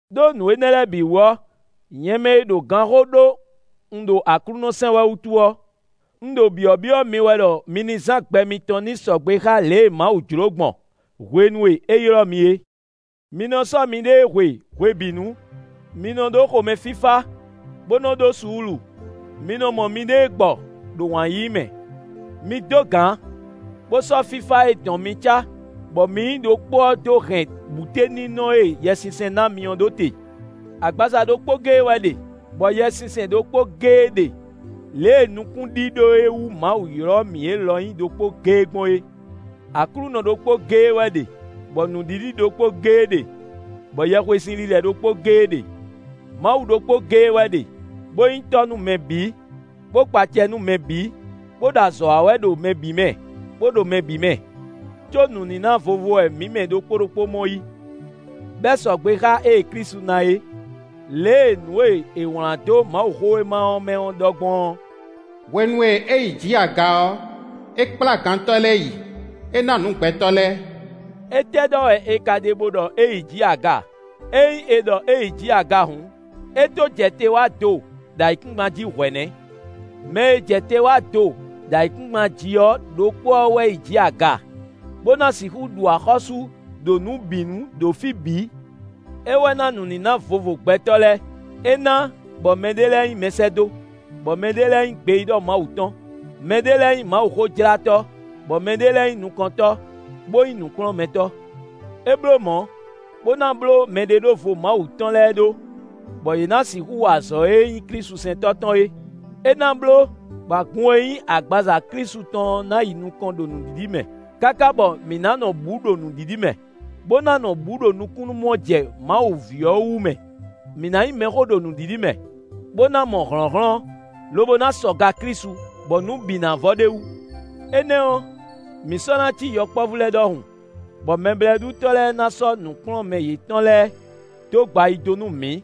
Đó nǔ énɛ́ lɛ́ɛ bǐ wú ɔ́, nyɛ mɛ e ɖo ganxó ɖó un ɖo Aklúnɔ sɛn wɛ wútu ɔ́, un ɖo byɔ̌byɔ́ mi wɛ ɖɔ mi ní zán gbɛ mitɔn ní sɔgbe xá lě e Mawu jló gbɔn hwenu e é ylɔ́ mi é. Mi nɔ sɔ́ miɖée hwe hwebǐnu; mi nɔ ɖó xomɛfífá, bó nɔ́ ɖó suúlu. Mi nɔ mɔ miɖée gbɔ ɖo wǎn yíyí mɛ. Mi dó gǎn, bó sɔ́ fífá e dɔn mi cá, bɔ mi nyí ɖokpó ɔ́ dó hɛn bǔteninɔ e Yɛsinsɛn ná mi ɔ́ ɖó te. Agbaza ɖokpó géé wɛ ɖe, bɔ Yɛsinsɛn ɖokpó géé ɖe lě e nukúnɖíɖó e wú Mawu ylɔ́ mǐ é lɔ nyí ɖokpó géé gbɔn é. Aklúnɔ ɖokpó géé wɛ ɖe, bɔ nǔɖiɖi ɖokpó géé ɖe, bɔ yɛhwesinlilɛ ɖokpó géé ɖe. Mawu ɖokpó géé wɛ ɖe, bó nyí Tɔ́ nú mɛ bǐ, bó kpa acɛ nú mɛ bǐ, bó ɖo azɔ̌ wa wɛ ɖo mɛ bǐ mɛ, bó ɖo mɛ bǐ mɛ. Có nǔníná vovo wɛ mǐ mɛ ɖokpó ɖokpó mɔ yí, bɔ é sɔgbe xá ée Klísu ná é. Lě e nǔ e è wlǎn dó Mawuxówéma ɔ́ mɛ ɔ́ ɖɔ gbɔn ɔ́: “Hwenu e é yi jǐ aga ɔ́, é kplá gantɔ́ lɛ́ɛ yi, é ná nǔ gbɛtɔ́ lɛ́ɛ.” Étɛ́ ɖɔ wɛ è ka ɖe bó ɖɔ é yi jǐ aga? Ényí è ɖɔ é yi jǐ aga hǔn, é tó jɛ te wá do ɖo ayǐkúngban jí hwɛ̌ nɛ́! Mɛ e jɛ te wá do ɖo ayǐkúngban jí ɔ́ ɖokpó ɔ́ wɛ yi jǐ aga, bó ná sixú ɖu axɔ́sú ɖo nǔ bǐ nu ɖo fí bǐ. É wɛ ná nǔníná vovo gbɛtɔ́ lɛ́ɛ. É ná, bɔ mɛɖé lɛ́ɛ nyí mɛsɛ́dó, bɔ mɛɖé lɛ́ɛ nyí gbeyíɖɔ Mawu tɔn, mɛɖé lɛ́ɛ nyí Mawuxójlátɔ́, bɔ mɛɖé lɛ́ɛ nyí nukɔntɔ́, bó nyí nǔkplɔ́nmɛtɔ́. É bló mɔ̌, bó ná bló mɛɖeɖóvo Mawu tɔn lɛ́ɛ ɖó, bɔ yě ná sixú wa azɔ̌ e nyí klísusɛntɔ́ tɔn é; é ná bló bɔ agun e nyí agbaza Klísu tɔn ɔ́ ná yi nukɔn ɖo nǔɖiɖi mɛ, káká bɔ mǐ ná nɔ bǔ ɖo nǔɖiɖi mɛ, bó ná nɔ bǔ ɖo nukúnnú mɔ jɛ Mawu ví ɔ́ wú mɛ; mǐ ná nyí mɛxó ɖo nǔɖiɖi mɛ, bó ná mɔ hlɔ̌nhlɔ́n, lobo ná sɔ ga Klísu, bɔ nǔ bǐ ná vɔ ɖ'é wú. Énɛ́ ɔ́, mǐ sɔ́ ná cí yɔkpɔ́vú lɛ́ɛ ɖɔhun, bɔ mɛblɛ́ɖutɔ́ lɛ́ɛ ná sɔ́ nǔkplɔ́nmɛ yětɔn lɛ́ɛ dó gba ayi dó nú mǐ,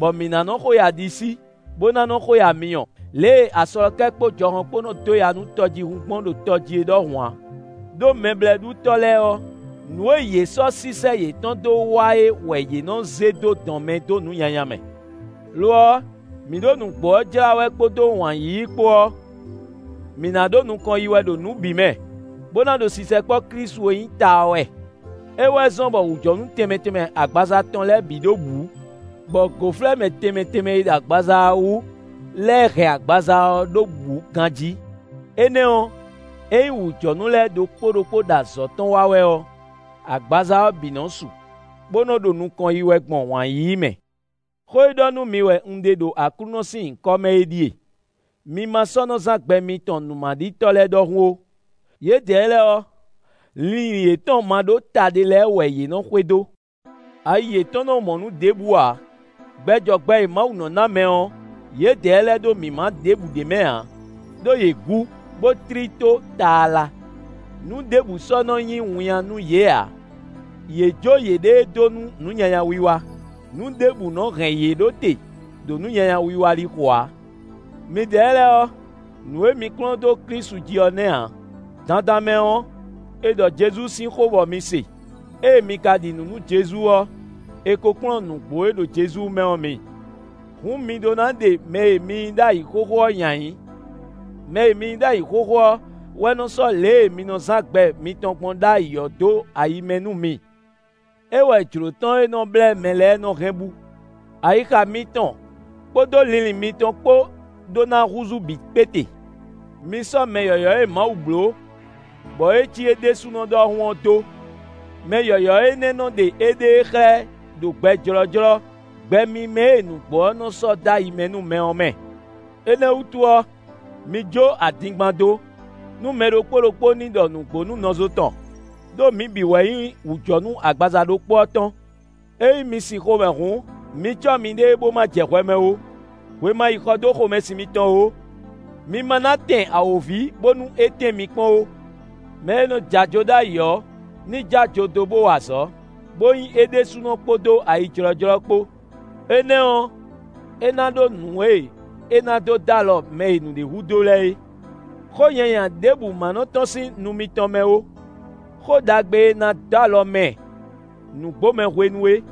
bɔ mǐ ná nɔ xo yi aɖisí, bó ná nɔ́ xo yi amyɔ, lě e aslɔkɛ́ kpó jɔhɔn kpó nɔ́ dó ya nú tɔjíhún gbɔn ɖo tɔjí é ɖɔhun ǎ. Đó mɛblɛ́ɖutɔ́ lɛ́ɛ ɔ́, nǔ e yě sɔ́ sísɛ́ yětɔn dó wa é wɛ yě nɔ́ zé dó dɔn mɛ dó nǔ nyanya mɛ. Lo ɔ́, mǐ ɖo nǔgbó ɔ́ jlá wɛ kpódó wǎn yíyí kpó ɔ́, mǐ ná ɖo nukɔn yi wɛ ɖo nǔ bǐ mɛ, bó ná ɖo sisɛkpɔ́ Klísu e nyí ta ɔ́ wɛ. É wɛ zɔ́n bɔ wǔjɔnú tɛnmɛ tɛnmɛ agbaza tɔn lɛ́ɛ bǐ ɖo bǔ, bɔ gǒflɛ́mɛ tɛnmɛ tɛnmɛ e ɖo agbaza ɔ́ wú lɛ́ɛ hɛn agbaza ɔ́ ɖó bǔ ganjí. Énɛ́ ɔ́, ényí wǔjɔnú lɛ́ɛ ɖokpó ɖokpó ɖo azɔ̌ tɔn wa wɛ ɔ́, agbaza ɔ́ bǐ nɔ su, bó nɔ ɖo nukɔn yi wɛ gbɔn wǎn yíyí mɛ. Xó e ɖɔ nú mi wɛ un ɖe ɖo Aklúnɔ sín nyǐkɔ mɛ é ɖíe: mi ma sɔ́ nɔ zán gbɛ mitɔn nǔmaɖitɔ́ lɛ́ɛ ɖɔhun ó; yědɛɛ lɛ́ɛ ɔ́, linlin yětɔn ma ɖó ta ɖé lɛ́ɛ wɛ yě nɔ́ xwedó. Ayi yětɔn nɔ́ mɔ nǔ ɖěbǔ ǎ. Gbɛ jɔ gbɛ e Mawu nɔ́ ná mɛ ɔ́, yědɛɛ lɛ́ɛ ɖó mǐmá ɖěbǔ ɖ'é mɛ ǎ; ɖó yě gǔ, bó tlí tó taala. Nǔ ɖěbǔ sɔ́ nɔ́ nyí winnyá nú yě ǎ; yě jó yěɖée dó nú nǔ nyanya wiwa; nǔ ɖěbǔ nɔ́ hɛn yě ɖó te ɖo nǔ nyanya wiwa lixo ǎ. Midɛɛ lɛ́ɛ ɔ́, nǔ e mi kplɔ́n dó Klísu jí ɔ́ nɛ́ ǎ. Dandan mɛ ɔ́, è ɖɔ Jezu sín xó bɔ mi se. Ée mi ka ɖi nǔ nú Jezu ɔ́, è ko kplɔ́n nǔgbó e ɖo Jezu mɛ ɔ́ mi. Hǔn mi ɖó ná ɖe mɛ e mi nyí ɖ'ayǐ xóxó ɔ́ nyi ayǐ. Mɛ e mi nyí ɖ'ayǐ xóxó ɔ́ wɛ nɔ sɔ́ lě e mi nɔ zán gbɛ mitɔn gbɔn ɖ'ayǐ ɔ́ dó ayi mɛ nú mi. É wɛ jlǒ tɔn e nɔ blɛ́ mɛ lɛ́ɛ nɔ hɛn bú. Ayixa mitɔn kpódó linlin mitɔn kpó ɖó ná húzú bǐ kpéte. Mi sɔ́ mɛ yɔ̌yɔ́ e Mawu bló, bɔ é cí é ɖésúnɔ ɖɔhun ɔ́ dó. Mɛ yɔ̌yɔ́ énɛ́ nɔ́ ɖe éɖée xlɛ́ ɖo gbɛ jlɔ́jlɔ́, gbɛ mímɛ́ e nǔgbó ɔ́ nɔ sɔ́ dó ayi mɛ nú mɛ ɔ́ mɛ. Énɛ́ wútu ɔ́, mi jó adingban dó, nú mɛ ɖokpó ɖokpó ní ɖɔ nǔgbó nú nɔzo tɔn, ɖó mǐ bǐ wɛ nyí wǔjɔnú agbaza ɖokpó ɔ́ tɔn. Ényí mi sin xomɛ hǔn, mi cɔ́ miɖée bó ma jɛ hwɛ mɛ ó; hwe ma yi xɔ dó xomɛsin mitɔn ó. Mi ma ná tɛn awǒvi bónú é tɛ́n mi kpɔ́n ó. Mɛ e nɔ jɛ ajo ɖ'ayǐ ɔ́, ní jó ajo dó bó wa azɔ̌, bó nyí é ɖésúnɔ kpódó ayijlɔ́jlɔ́ kpó; énɛ́ ɔ́, é ná ɖó nǔ e é ná dó dó alɔ mɛ e nǔɖé hudó lɛ́ɛ é. Xó nyanya ɖěbǔ má nɔ tɔ́n sín nu mitɔn mɛ ó. Xó ɖagbe e ná dó alɔ mɛ nǔgbomɛ hwenu é,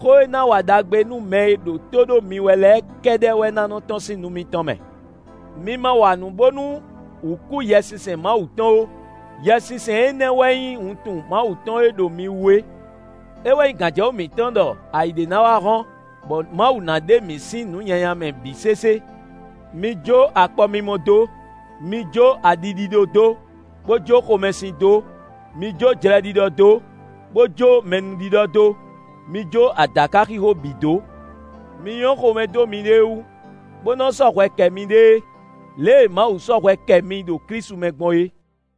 xó e ná wa ɖagbe nú mɛ e ɖo tó ɖó mi wɛ lɛ́ɛ kɛ́ɖɛ́ wɛ ná nɔ́ tɔ́n sín nu mitɔn mɛ. Mi ma wa nǔ bónú wǔ kú Yɛsinsɛn Mawu tɔn ó; Yɛsinsɛn énɛ́ wɛ nyí wuntun Mawu tɔn e ɖo mi wú é. É wɛ nyí gǎnjɛwú mǐtɔn ɖɔ ayǐ ɖé ná wá hɔ́n, bɔ Mawu ná ɖe mǐ sín nǔ nyanya mɛ bǐ sésé. Mi jó akpɔmimɔ dó; mi jó aɖi ɖíɖó dó, bó jó xomɛsin dó; mi jó jlɛɖiɖɔ dó, bó jó mɛnúɖiɖɔ dó. Mi jó adǎkaxixo bǐ dó. Mi nyɔ́ xomɛ dó miɖée wú, bó nɔ́ sɔ́ hwɛ kɛ miɖée, lě e Mawu sɔ́ hwɛ kɛ mi ɖo Klísu mɛ gbɔn é.